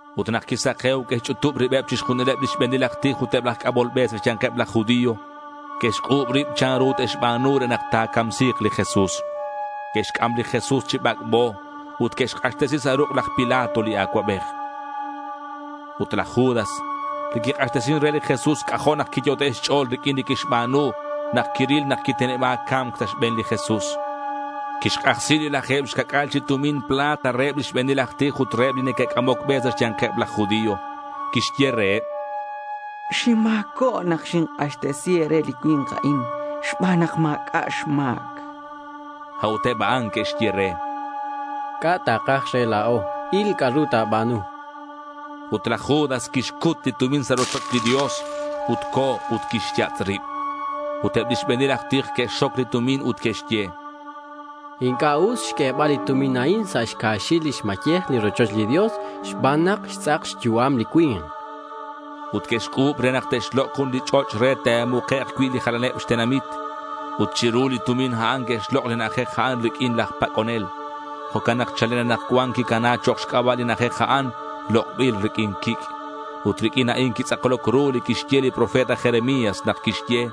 Ut nak quisake̱u, que'xch'utub ribeb chixjunileb lix be̱nil aj tij ut eb laj c'amol be sa' xya̱nkeb laj judío. Que'xc'u̱b rib chanru te'xba̱nu re nak ta̱camsi̱k li Jesús. Que'xc'am li Jesús chi bac'bo ut que'xk'axtesi sa' ruk' laj Pilato li acuabej. Ut laj Judas li quik'axtesin re li Jesús, c'ajo' nak quiyot'e' xch'o̱l riq'uin li quixba̱nu nak quiril nak quiteneba̱c ca̱mc sa' xbe̱n li Jesús. Quixk'ajsi li laje̱b xca'c'a̱l chi tumin plata reheb lix be̱nil aj tij ut reheb li neque'c'amoc be sa' xya̱nkeb laj judío. Quixye reheb: —Xinma̱cob nak xink'axtesi e̱re li cui̱nk a'in xban nak ma̱c'a' xma̱c, chan. A'ut eb a'an que'xye re: —¿C'a' takaj re la̱o? Il c'a'ru ta̱ba̱nu.— Ut laj Judas quixcut li tumin sa' rochoch li Dios. Ut co̱ ut quixyatz' rib. Ut eb lix be̱nil aj tij que'xxoc li tumin ut que'xye: —Inc'a' us xq'uebal li tumin a'in sa' xcaxil lix mayej li rochoch li Dios xban nak xtz'ak xyu'am li cui̱nk.— Ut que'xc'u̱b ru nak te'xlok' jun li ch'och' re te'mukek' cui' li jalaneb xtenamit. Ut chiru li tumin a'an que'xlok' li na'ajej a'an riq'uin laj pac'onel. Jo'can nak chalen anakcuan quicana chok' xc'aba' li na'ajej a'an “Lok'bil riq'uin Quic'.” Ut riq'uin a'in quitz'akloc ru li quixye li profeta Jeremías nak quixye: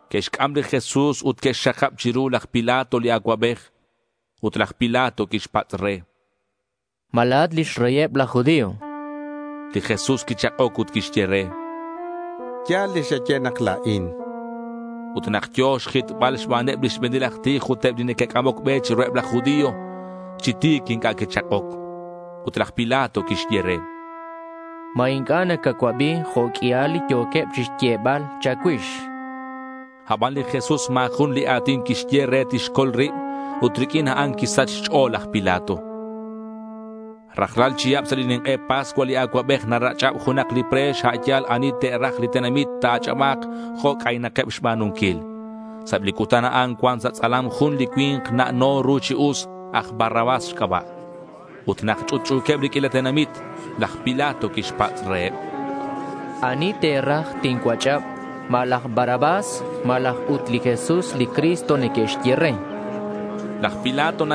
Que'xc'am li Jesús ut que'xxakab chiru laj Pilato li acuabej. Ut laj Pilato quixpatz' re: —¿Ma la̱at lix Reyeb laj judío?— Li Jesús quichak'oc ut quixye re: —Ya̱l li xaye nak la̱in.— Ut nak yo̱ xjitbal xbaneb lix be̱nil aj tij ut eb li neque'c'amoc be chiruheb laj judío, chi ti̱c inc'a' quichak'oc. Ut laj Pilato quixye re: —¿Ma inc'a' nacacuabi jo' q'uial li yo̱queb chixyebal cha̱cuix?— Aban li Jesús ma̱ jun li a̱tin quixye re tixcol rib ut riq'uin a'an quisach xch'o̱l laj Pilato. Rajlal chihab sa' li nink'e Pascua li acuabej narach'ab junak li pre̱x a' ya̱l ani te'raj li tenamit ta̱ach'aba̱k jo' c'aynakeb xba̱nunquil. Sa' eb li cutan a'an cuan sa' tz'alam jun li cui̱nk na'no ru chi us, aj Barrabás xc'aba'. Ut nak ch'utch'u̱queb li q'uila tenamit, laj Pilato quixpatz' reheb: —¿Ani te̱raj tincuach'ab? ¿Ma laj Barrabás, malaj ut li Jesús li Cristo neque'xye re? chan laj Pilato.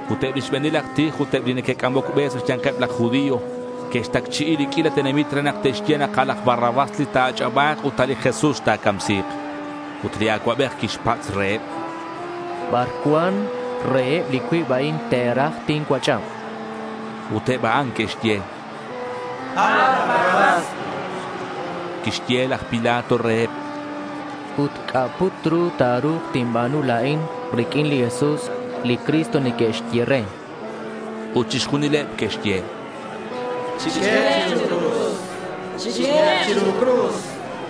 Ut eb li xbe̱nil aj tij ut eb li neque'c'amoc be sa' xya̱nkeb laj judío que'xtacchi'i li q'uila tenamit re nak te'xye nak a' laj Barrabás li ta̱ach'aba̱k, ut a' li Jesús ta̱camsi̱k. Ut li acuabej quixpatz' reheb: —¿Bar cuan reheb li cuib a'in te̱raj tincuach'ab?— Ut eb a'an que'xye: —A' laj Barrabás, chanqueb. Quixye laj Pilato reheb: —Ut, ¿c'a' put ru ta̱ru̱k tinba̱nu la̱in riq'uin li Jesús, li Cristo neque'xye re?— Ut chixjunileb que'xye: —¡Chiq'uehek' chiru cruz!—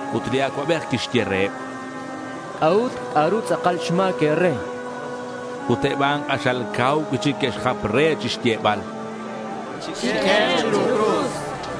Ut li acuabej quixye reheb: —¿C'a'ut? ¿C'a'ru tz'akal xma̱c e̱re?— Ut eb a'an k'axal cau cui'chic que'xjap re chixyebal: —¡Chiq'uehek' chiru cruz!—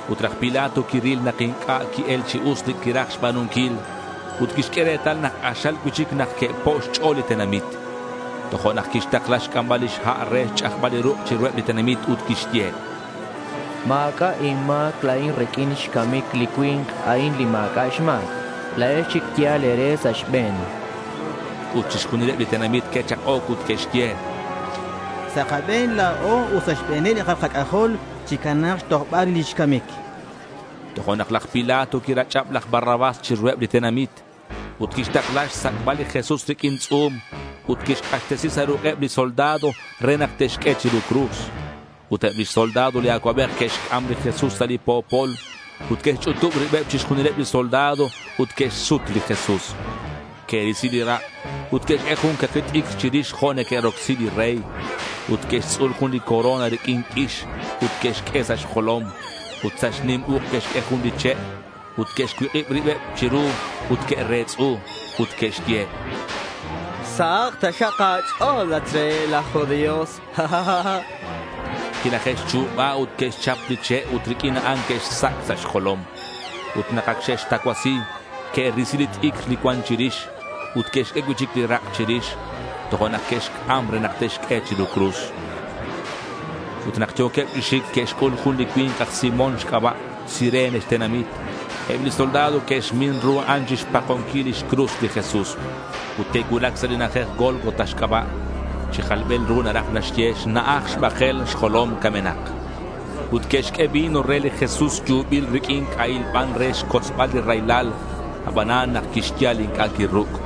Ut laj Pilato quiril nak inc'a' qui-el chi us li quiraj xba̱nunquil ut quixq'ue retal nak k'axal cui'chic nak que'po' xch'o̱l li tenamit. Tojo'nak quixtakla xc'ambal lix ha' re xch'ajbal li ruk' chiruheb li tenamit ut quixye: —Ma̱c'a' inma̱c la̱in riq'uin xcamic li cui̱nk a'in li ma̱c'a' xma̱c. La̱ex chic yal e̱re sa' xbe̱n, chan. Ut chixjunileb li tenamit que'chak'oc ut que'xye: —Sa' kabe̱n la̱o ut sa' xbe̱neb li kalal kac'ajol chicana̱k xtojbal rix lix camic, chanqueb. Tojo'nak laj Pilato quirach'ab laj Barrabás chiruheb li tenamit. Ut quixtakla xsac'bal li Jesús riq'uin tz'u̱m ut quixk'axtesi sa' ruk'eb li soldado re nak te'xq'ue chiru cruz. Ut eb lix soldado li acuabej que'xc'am li Jesús sa' li po̱pol ut que'xch'utub ribeb chixjunileb li soldado ut que'xsut li Jesús. Que'risi li rak' ut que'xq'ue jun caki t'icr chirix jo' neque'rocsi li rey. Ut que'xtz'ul jun li corona riq'uin q'uix ut que'xq'ue sa' xjolom. Ut sa' xnim uk' que'xq'ue jun li che'. Ut que'xcuik'ib ribeb chiru ut que'retz'u ut que'xye: —Sahak taxak sa' a̱ch'o̱l, at xReyeb laj judío, chanqueb re. Quilaje'xchu̱ba, ut que'xchap li che' ut riq'uin a'an que'xsac' sa' xjolom. Ut nak ac xe'xtacuasi, que'risi li t'icr li cuan chirix. Ut que'xq'ue cui'chic li rak' chirix. Tojo'nak que'xc'am re nak te'xq'ue chiru cruz. Ut nak yo̱queb chi xic, que'xc'ul jun li cui̱nk aj Simón xc'aba', Cirene xtenamit. Eb li soldado que'xmin ru a'an chixpakonquil lix cruz li Jesús. Ut que'cuulac sa' li na'ajej Gólgota xc'aba'. Chi jalbil ru naraj naxye: Xna'aj Xbakel Xjolom Camenak. Ut que'xq'ue vino re li Jesús yubil riq'uin c'ahil ban re xcotzbal li raylal, abanan nak quixyal, inc'a' quiruc'.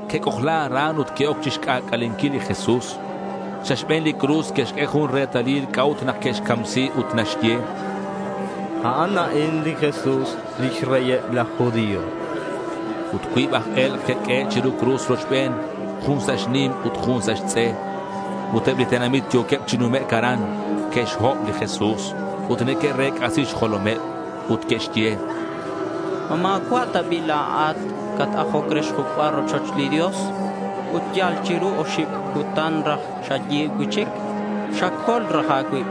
Que'c'ojla aran ut que'oc chixc'ac'alenquil li Jesús. Sa' xbe̱n li cruz que'xq'ue jun retalil c'a'ut nak que'xcamsi ut naxye: A'an a'in li Jesús, lix Reyeb laj judío. Ut cuib aj e̱lk' que'q'uehe' chiru cruz rochben, jun sa' xnim ut jun sa' xtz'e. Ut eb li tenamit yo̱queb chi numec' aran, que'xhob li Jesús ut neque'rec'asi xjolomeb. Ut que'xye: —¿Ma ma̱cua' ta bi' la̱at li cat-ajoc re xjuc'bal rochoch li Dios, ut yal chiru oxib cutan raj xayi̱b cui'chic? Xacol raj a̱cuib.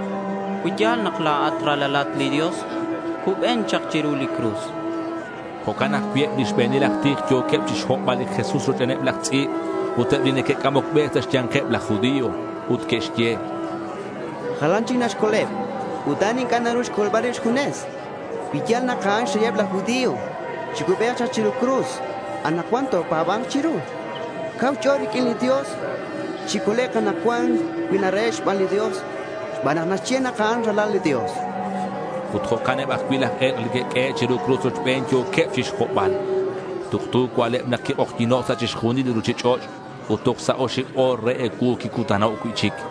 Cui ya̱l nak la̱at Ralalat li Dios, cuben chak chiru li cruz, chanqueb. Jo'can ajcui' eb li xbe̱nil aj tij yo̱queb chixhobbal li Jesús rochbeneb laj tz'i̱b ut eb li neque'c'amoc be sa' xya̱nkeb laj judío. Ut que'xye: —Jalan chic xcoleb ut a'an inc'a' naru naxcol rib xjunes. Cui ya̱l nak a'an xReyeb laj judío, chicubek chak chiru li cruz anakcuan ut topa̱ba̱nk chiru. Cau xch'o̱l riq'uin li Dios. Chicolek' anakcuan cui narahe' xban li Dios xban nak naxye nak a'an Ralal li Dios, chanqueb. Ut jo'can eb ajcui' laj e̱lk' li que'q'uehe' chiru cruz rochben, yo̱queb chixhobbal. Tuktu cua'leb nak quik'ojyi̱no' sa' chixjunil li ruchich'och' ut toj sa' oxib o̱r re ecuu quicutano' cui'chic.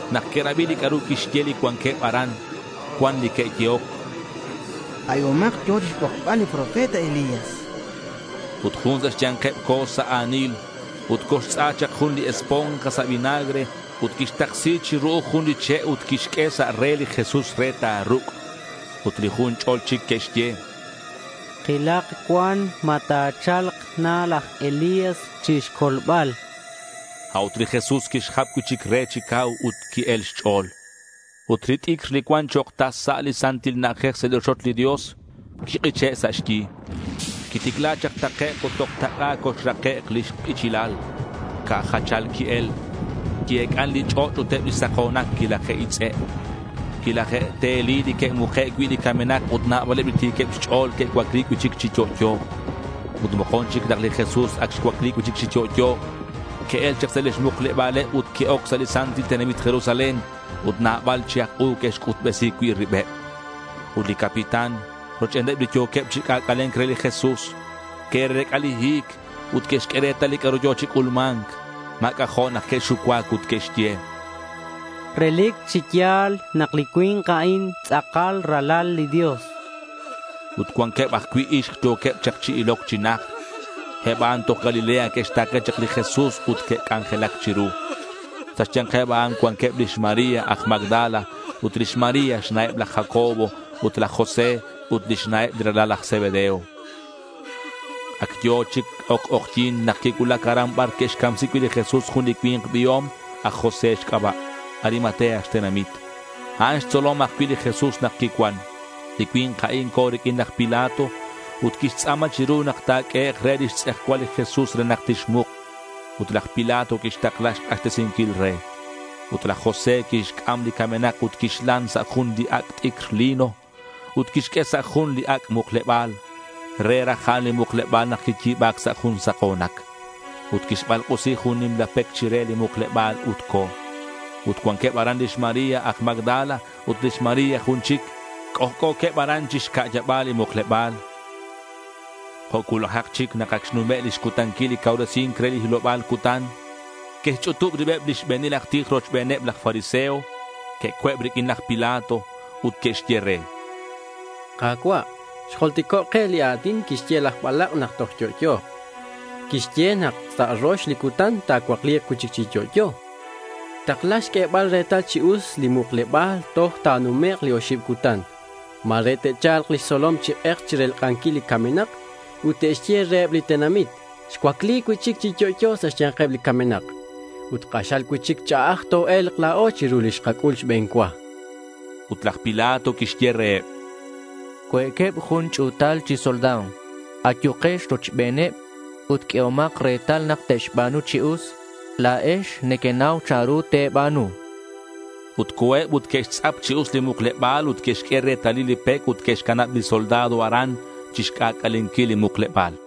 Nak que'rabi li c'a'ru quixye li cuanqueb aran, cuan li que'yehoc: —Abihomak, yo̱ chixbokbal li profeta Elías, chanqueb. Ut jun sa' xya̱nkeb co̱ sa' a̱nil ut coxtz'a chak jun li esponja sa' vinagre ut quixtaksi chi ru'uj jun li che' ut quixq'ue sa' re li Jesús re ta̱ruc'. Ut li jun ch'o̱l chic que'xye: —Kilak cuan ma ta̱cha̱lk na laj Elías chixcolbal, chanqueb. A'ut li Jesús quixjap cui'chic re chi cau ut qui-el xch'o̱l. Ut li t'icr li cuan chok' tas sa' li Santil Na'ajej sa' li rochoch li Dios quik'iche' sa' xyi. Quiticla chak takec' ut toj tak'a coxrake' lix k'ichilal. Ca' jachal qui-el. Qui-ec'an li ch'och' ut eb li sako̱nac quilaje'itz'e'. Quilaje'teli li que'muke' cui' li camenak ut nabaleb li ti̱queb xch'o̱l que'cuacli cui'chic chi yo'yo. Ut mokon chic nak li Jesús ac xcuacli cui'chic chi yo'yo, que'el chak sa' lix mukleba̱l ut que'oc sa' li santil tenamit Jerusalén ut nabal chi aj u que'xc'utbesi cui' ribeb. Ut li capitán rochbeneb li yo̱queb chi c'ac'ale̱nc re li Jesús, que'rec'a li hi̱c ut que'xq'ue retal li c'a'ru yo̱ chi c'ulma̱nc. Ma̱ c'ajo' nak que'xucuac ut que'xye: —Relic chi ya̱l nak li cui̱nk a'in tz'akal Ralal li Dios.— Ut cuanqueb ajcui' ixk yo̱queb chak chi iloc chi najt. Eb a'an toj Galilea que'xta̱ke chak li Jesús ut que'c'anjelac chiru. Sa' xya̱nkeb a'an cuanqueb lix María aj Magdala, ut lix María xna'eb laj Jacobo ut laj José, ut lix na'eb li ralal laj Zebedeo. Ac yo̱ chi oc k'ojyi̱n nak quicuulac aran bar que'xcamsi cui' li Jesús jun li cui̱nk biom, aj José xc'aba'. Arimatea xtenamit. A'an xtzolom ajcui' li Jesús nak quicuan. Li cui̱nk a'in co̱ riq'uin laj Pilato ut quixtz'a̱ma chiru nak ta̱q'uehek' re lix tz'ejcual li Jesús re nak tixmuk. Ut laj Pilato quixtakla xk'axtesinquil re. Ut laj José quixc'am li camenak ut quixlan sa' jun li ac' t'icr lino. Ut quixq'ue sa' jun li ac' mukleba̱l. Re raj a'an li mukleba̱l nak quiyi̱ba̱c sa' jun sako̱nac. Ut quixbalk'usi jun nimla pec chire li mukleba̱l ut co̱. Ut cuanqueb aran lix María aj Magdala ut lix María jun chic. C'ojc'o̱queb aran chi xca'yaba̱l li mukleba̱l. Jo' cuulajak chic, nak ac xnume' lix cutanquil li cauresi̱nc re li hiloba̱l cutan, que'xch'utub ribeb li xbe̱nil aj tij rochbeneb laj fariseo. Que'co̱eb riq'uin laj Pilato. Ut que'xye re: —Ka̱cua', xjultico' ke li a̱tin quixye laj balak' nak toj yo'yo̱k. Quixye nak sa' rox li cutan ta̱cuacli̱k cui'chic chi yo'yo. Takla xq'uebal retal chi us li mukleba̱l toj ta̱numek' li oxib cutan. Ma̱re te'cha̱lk lix tzolom chi k'ek chirelk'anquil li camenak ut te'xye reheb li tenamit, “Xcuacli cui'chic chi yo'yo sa' xya̱nkeb li camenak.” Ut k'axal cui'chic ch'a'aj toe̱lk la̱o chiru li xkac'ul xbe̱n cua. Ut laj Pilato quixye reheb: —Cue'queb jun ch'u̱tal chi soldado. Ayukex rochbeneb ut q'uehomak retal nak te'xba̱nu chi us. La̱ex nequenau chanru te̱ba̱nu, chan. Ut co̱eb ut que'xtz'ap chi us li mukleba̱l ut que'xq'ue retalil li pec ut que'xcanab li soldado aran chixc'ac'alenquil li mukleba̱l.